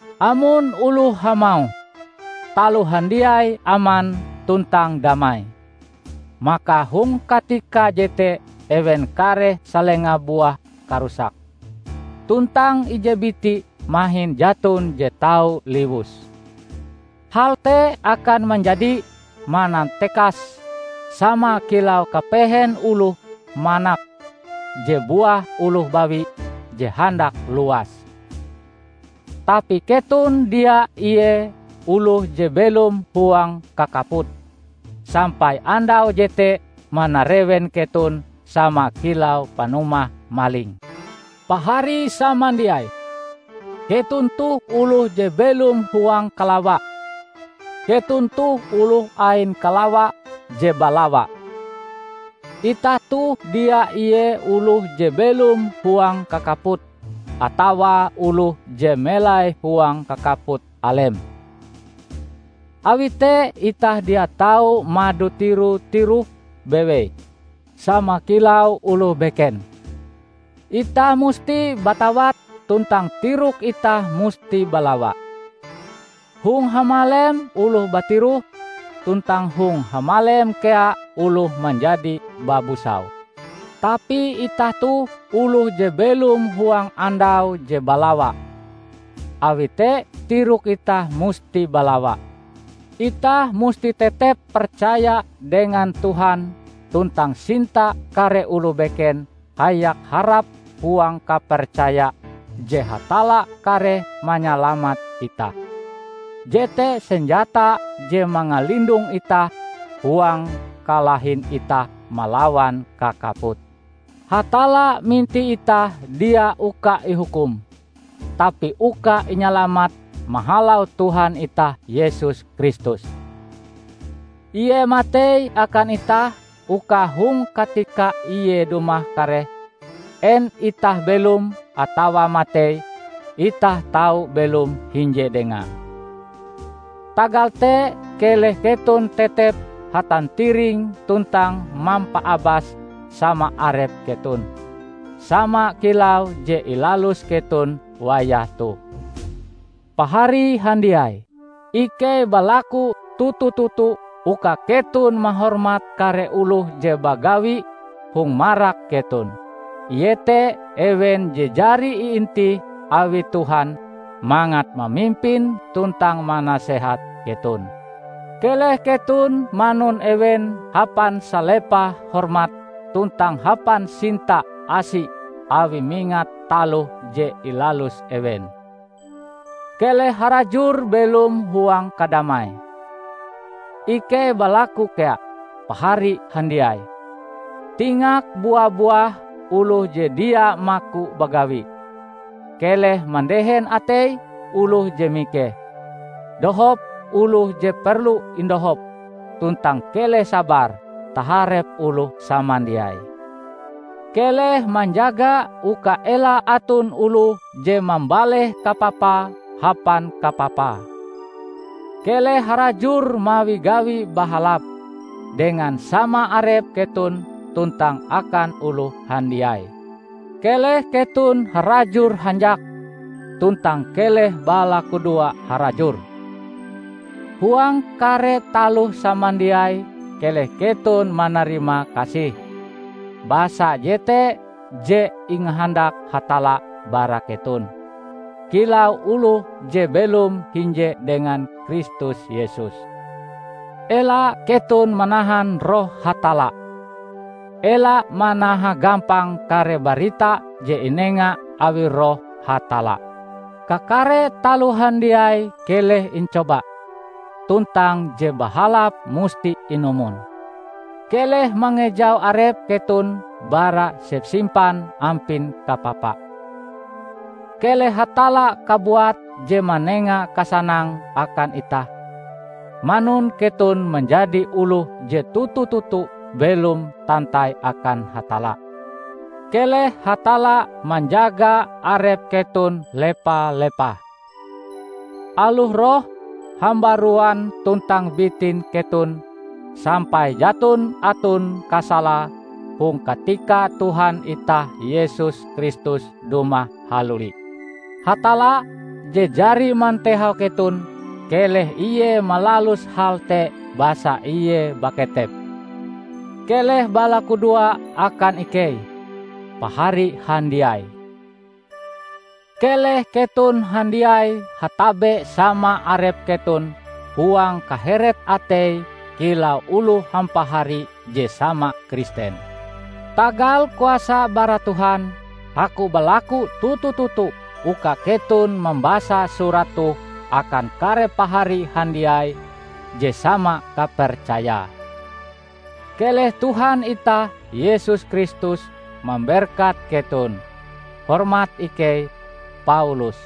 Amon oloh hamauh, "Taloh handiai aman tuntang damai," maka hong katika jete ewen kareh salenga buah karusak, tuntang ije biti mahin jaton je tau liwus. Hal te akan manjadi manantekas, sama kilau kapehen oloh manak je buah oloh bawi je handak luas. Tapi keton dia ie oloh je belom huang kakaput, sampai andau jete manarewen keton sama kilau panumah maling. Pahari samandiai, keton toh oloh je belom huang kalawa; keton toh oloh ain kalawa je balawa. Itah toh dia ie oloh je belom huang kakaput, atawa oloh je melai huang kakaput alem. Awi te itah dia tau mado tiro-tiroh bewei sama kilau oloh beken. Itah musti batawat tuntang tirok itah musti balawa. Hong hamalem oloh batiroh, tuntang hong hamalem kea oloh manjadi babusau. Tapi itah toh oloh je belom huang andau je balawa; awi te tirok itah musti balawa. Itah musti tetep percaya dengan Tuhan tuntang sinta kare oloh beken hayak harap huang kapercaya je Hatalla kareh manyalamat itah. Jete senjata je mangalindong itah huang kalahin itah malawan kakaput. Hatalla mintih itah dia uka ihukum, tapi uka inyalamat mahalau Tuhan itah Yesus Kristus. Ie matei akan itah uka hong katika Ie dumah kareh -- en itah belom atawa matei itah tau belom hinje Dengae. Tagal te keleh keton tetep hatantiring tuntang mampaabas sama arep keton, sama kilau je ilalus keton wayah toh. Pahari handiai, ikei balaku toto-toto uka keton mahormat kare oloh je bagawi hong marak keton; iete ewen je jari iintih awi Tuhan mangat mamimpin tuntang manasehat keton. Keleh keton manun ewen hapan salepah hormat tuntang hapan sinta asi awi mingat taloh je ilalus ewen. Keleh harajur belom huang kadamai. Ikei balaku kea, pahari handiai, tingak bua-buah oloh je dia maku bagawi; keleh mandehen atei oloh je mikeh; dohop oloh je perlu indohop tuntang keleh sabar taharep oloh samandiai. Keleh manjaga uka ela aton oloh je mambaleh kapapa hapan kapapa. Keleh harajur mawi gawi bahalap, dengan sama arep keton tuntang akan oloh handiai. Keleh keton harajur hanjak, tuntang keleh balakudoa harajur. Huang kare taloh samandiai keleh keton manarimakasih, basa jete je ingahandak Hatalla bara keton, kilau oloh je belom hinje dengan Kristus Yesus. Ela keton manahan Roh Hatalla. Ela manaha gampang kare barita je inenga awi Roh Hatalla. Kakare taloh handiai keleh incoba, tuntang je bahalap musti inumon. Keleh mangejau arep keton bara sepsimpan ampin kapapa. Keleh Hatalla kabuat je manenga kasanang akan itah, manun keton manjadi oloh je toto-toto belom tantai akan Hatalla. Keleh Hatalla manjaga arep keton lepa-lepah, aloh roh, hambaruan tuntang bitin keton, sampai jaton aton kasalae hong katika Tuhan itah Yesus Kristus dumah haluli. Hatalla, je jari mantehau keton, keleh Ie malalus hal te basa Ie baketep. Keleh balakudoa akan ikei, Pahari handiai! Keleh keton handiai hatabe sama arep keton huang kaheret atei kilau oloh hampahari je sama Kristen. Tagal kuasa bara Tuhan, aku balaku toto-toto uka keton mambasa surat toh akan kare pahari handiai je sama kapercayae. Keleh Tuhan itah Yesus Kristus memberkat keton. Hormat ikei, Paulus